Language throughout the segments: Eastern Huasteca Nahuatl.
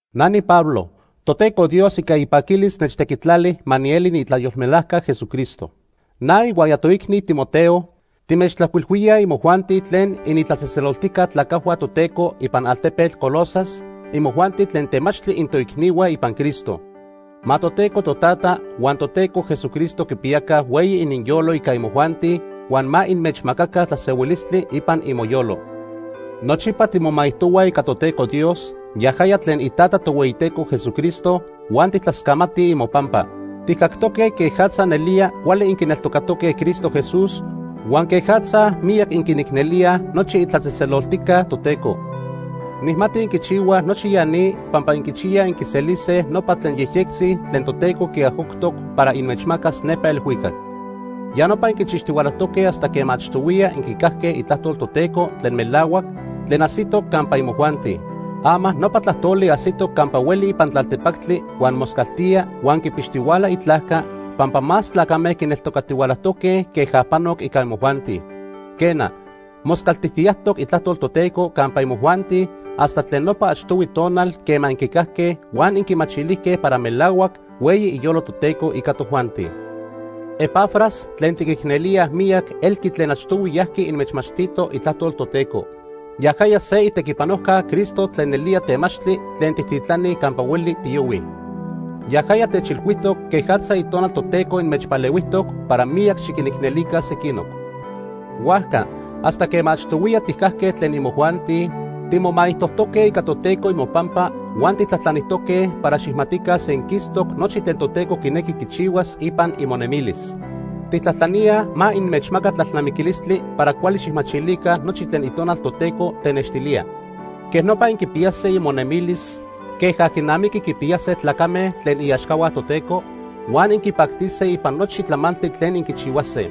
Na niPablo. Toteco Dios ica ipaquilis nechtequitlali ma nieli niitlayolmelajca Jesucristo. Na ihuaya toicni Timoteo, timechtlajcuilhuíaj imojuanti tlen initlatzejtzeloltijca tlacajhua Toteco ipan altepetl Colosas, imojuanti tlen temachtli intoicnihua ipan Cristo. Ma Toteco Totata huan Toteco Jesucristo quipiyaca hueyi ininyolo ica imojuanti huan ma inmechmacaca tlasehuilistli ipan imoyolo. Nochipa timomaijtohuaj ica Toteco Dios, yajaya tlen iTata Tohueyiteco Jesucristo huan tijtlascamatij imopampa. Tijcactoque quejatza nelía cuali inquineltocatoque Cristo Jesús huan quejatza miyac inquinicnelíaj nochi itlatzejtzeloltijca Toteco. Nijmati inquichihuaj nochi ya ni pampa inquichiyaj inquiselise nopa tlen yejyectzi tlen Toteco quiajcoctoc para inmechmacas nepa elhuicac. Ya nopa inquichixtihualajtoque hasta quema achtohuiya inquicajque itlajtol Toteco tlen melahuac, tlen ajsitoc campa imojuanti. Ama nopa tlajtoli ajsitoc campa hueli ipan tlaltepactli huan moscaltía huan quipixtihuala itlajca pampa más tlacame quineltocatihualajtoque queja panoc ica imojuanti. Quena, moscaltijtiyajtoc itlajtol Toteco campa imojuanti hasta tlen nopa achtohui tonal quema inquicajque huan inquimachilijque para melahuac hueyi iyolo Toteco ica tojuanti. Epafras tlen tiquicnelíaj miyac elqui tlen achtohui yajqui inmechmachtito itlajtol Toteco. Yajaya se itequipanojca Cristo tlen nelía temachtli tlen tijtitlanij campa hueli tiyohuij. Yajaya techilhuijtoc quejatza Itonal Toteco inmechpalehuijtoc para miyac xiquinicnelica sequinoc. Huajca, hasta quema achtohuiya tijcajque tlen imojuanti timomaijtojtoque ica Toteco imopampa huan tijtlajtlanijtoque para xijmatica senquistoc nochi tlen Toteco quinequi quichihuas ipan imonemilis. Tijtlajtlaníaj ma inmechmaca tlalnamiquilistli para cuali xijmachilica nochi tlen Itonal Toteco tenextilía. Quejnopa inquipiyase imonemilis queja quinamiqui quipiyase tlacame tlen iaxcahua Toteco huan inquipactise ipan nochi tlamantli tlen inquichihuase.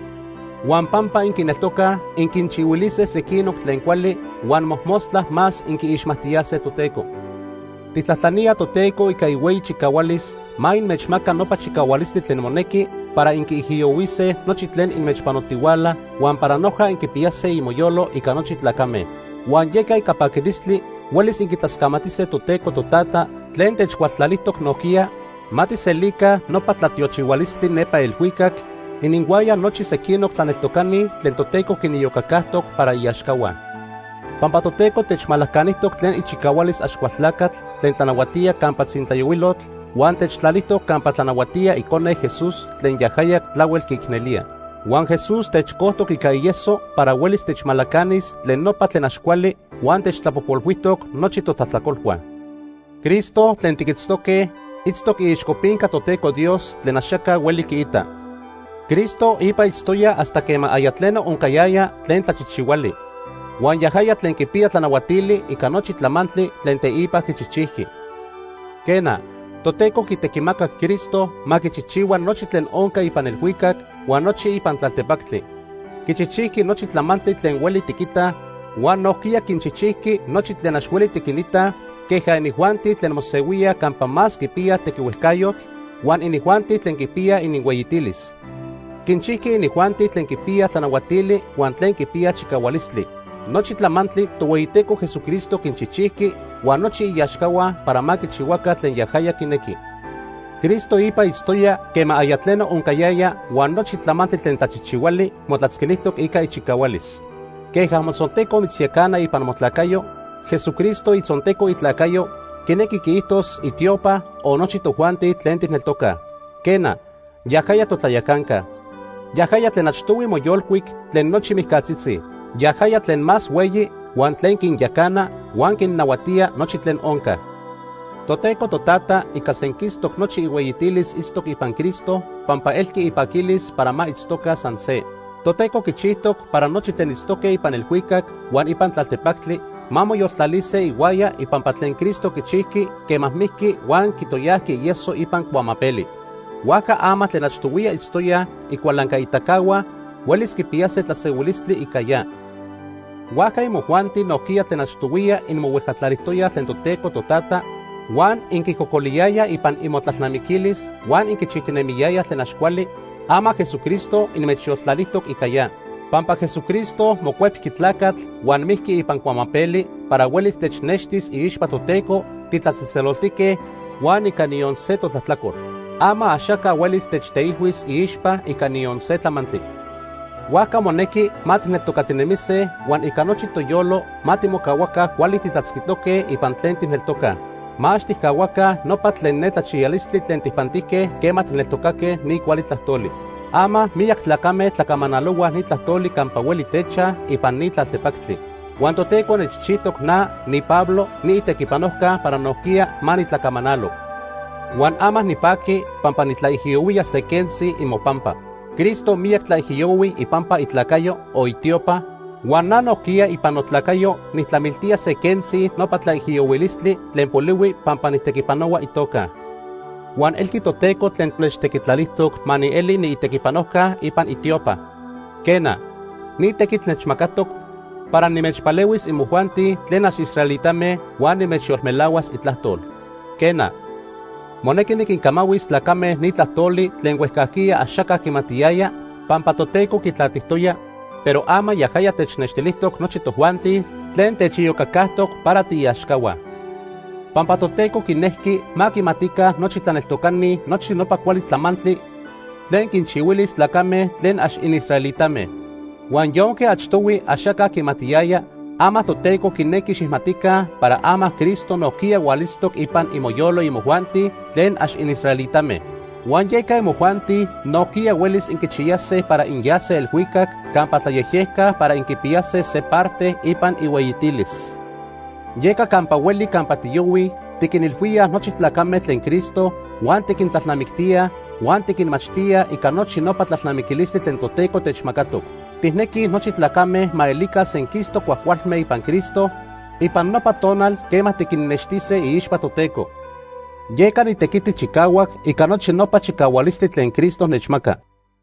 Huan pampa inquineltocaj, inquinchihuilise sequinoc tlen cuali huan mojmostla más inquiixmajtiyase Toteco. Tijtlajtlaníaj Toteco ica ihueyi chicahualis ma inmechmaca nopa chicahualistli tlen monequi para inquiijiyohuise nochi tlen inmechpanotihuala huan para noja inquipiyase imoyolo ica nochi tlacame. Huan yeca ica paquilistli huelis inquitlascamatise Toteco Totata tlen techcualtlalijtoc nojquiya ma tijselica nopa tlatiochihualistli nepa elhuicac ininhuaya nochi sequinoc tlaneltocani tlen Toteco quiniyocacajtoc para iaxcahua. Pampa Toteco techmalacanijtoc tlen ichicahualis Axcualtlacatl tlen tlanahuatía campa tzintlayohuilotl huan techtlalijtoc campa tlanahuatía Icone, Jesús, tlen yajaya tlahuel quiicnelía. Huan Jesús techcojtoc ica ieso para huelis techmalacanis tlen nopa tlen ax cuali huan techtlapojpolhuijtoc nochi totlajtlacolhua. Cristo tlen tiquitztoque itztoc iixcopinca Toteco Dios tlen axaca hueli quiita. Cristo ipa itztoya hasta quema aya tleno oncayaya tlen tlachijchijhuali. Huan yajaya tlen quipiya tlanahuatili ica nochi tlamantli tlen teipa quichijchijqui. Quena, Toteco quitequimacac Cristo ma quichijchihua nochi tlen onca ipan elhuicac huan nochi ipan tlaltepactli. Quichijchijqui nochi tlamantli tlen hueli tiquitaj huan nojquiya quinchijchijqui nochi tlen ax hueli tiquinitaj queja inijuanti tlen mosehuíaj campa más quipiyaj tequihuejcayotl, huan inijuanti tlen quipiyaj ininhueyitilis. Quinchijqui inijuanti tlen quipiyaj tlanahuatili huan tlen quipiyaj chicahualistli. Nochi tlamantli Tohueyiteco Jesucristo quinchijchijqui huan nochi iaxcahua para ma quichihuaca tlen yajaya quinequi. Cristo ipa itztoya quema aya tleno oncayaya huan nochi tlamantli tlen tlachijchihuali motlatzquilijtoc ica ichicahualis. Queja motzonteco mitzyacana ipan motlacayo, Jesucristo itzonteco itlacayo, quinequi quiijtos itiopa o nochi tojuanti tlen tijneltocaj. Quena, yajaya totlayacanca. Yajaya tlen achtohui moyolcuic tlen nochi mijcatzitzi. Yajaya tlen más hueyi huan tlen quinyacana huan quinnahuatía nochi tlen onca. Toteco Totata ica senquistoc nochi ihueyitilis itztoc ipan Cristo pampa elqui ipaquilis para ma itztoca san se. Toteco quichijtoc para nochi tlen itztoque ipan elhuicac huan ipan tlaltepactli ma moyoltlalise ihuaya ipampa tlen Cristo quichijqui quema mijqui huan quitoyajqui ieso ipan cuamapeli. Huajca ama tlen achtohuiya itztoyaj icualancaitacahua huelis quipiyase tlasehuilistli ica ya. Huajca imojuanti nojquiya tlen achtohuiya inmohuejcatlalijtoyaj tlen Toteco Totata, huan inquicocoliyayaj ipan imotlalnamiquilis huan inquichijtinemiyayaj tlen ax cuali, ama Jesucristo inmechyoltlalijtoc ica ya. Pampa Jesucristo mocuepqui tlacatl huan mijqui ipan cuamapeli para huelis technextis iixpa Toteco titlatzejtzeloltique huan ica niyon se totlajtlacol. Ama axaca huelis techteilhuis iixpa ica niyon se tlamantli. Huajca monequi ma tijneltocatinemise huan ica nochi toyolo ma timocahuaca cuali titlatzquitoque ipan tlen tijneltocaj. Ma ax tijcahuaca nopa tlen netlachiyalistli tlen tijpantijque quema tijneltocaque ni cuali tlajtoli. Ama miyac tlacame tlacamanalohuaj ni tlajtoli campa hueli techaj ipan ni tlaltepactli. Huan Toteco nechchijtoc na, niPablo, niitequipanojca para nojquiya ma nitlacamanalo. Huan ama nipaqui pampa nitlaijiyohuía se quentzi imopampa. Cristo miyac tlaijiyohui ipampa itlacayo o itiopa, huan na nojquiya ipan notlacayo nijtlamiltía se quentzi nopa tlaijiyohuilistli tlen polihui pampa nijtequipanohua itoca. Huan elqui Toteco tlen techtequitlalijtoc ma nieli niitequipanojca ipan itiopa. Quena, ni tequitl nechmacatoc para nimechpalehuis imojuanti tlen ax israelitame huan nimechyolmelahuas Itlajtol. Quena, monequi niquincamahuis tlacame ni tlajtoli tlen huejcajquiya axaca quimatiyaya pampa Toteco quitlatijtoya, pero ama yajaya technextilijtoc nochi tojuanti tlen techiyocacajtoc para tiiaxcahua. Pampa Toteco quinejqui ma quimatica nochi tlaneltocani nochi nopa cuali tlamantli tlen quinchihuilis tlacame tlen ax inisraelitame. Huan yonque achtohui axaca quimatiyaya, ama Toteco quinequi xijmatica para ama Cristo nojquiya hualitztoc ipan imoyolo imojuanti tlen ax inisraelitame, huan yeca imojuanti nojquiya huelis inquichiyase para inyase elhuicac campa tlayejyejca para inquipiyase se parte ipan ihueyitilis. Yeca campa hueli campa tiyohuij tiquinilhuíaj nochi tlacame tlen Cristo huan tiquintlalnamictíaj huan tiquinmachtíaj ica nochi nopa tlalnamiquilistli tlen Toteco techmacatoc. Tijnequij nochi tlacame ma elica senquistoc cuajcualme ipan Cristo ipan nopa tonal quema tiquinnextise iixpa Toteco. Yeca nitequiti chicahuac ica nochi nopa chicahualistli tlen Cristo nechmaca.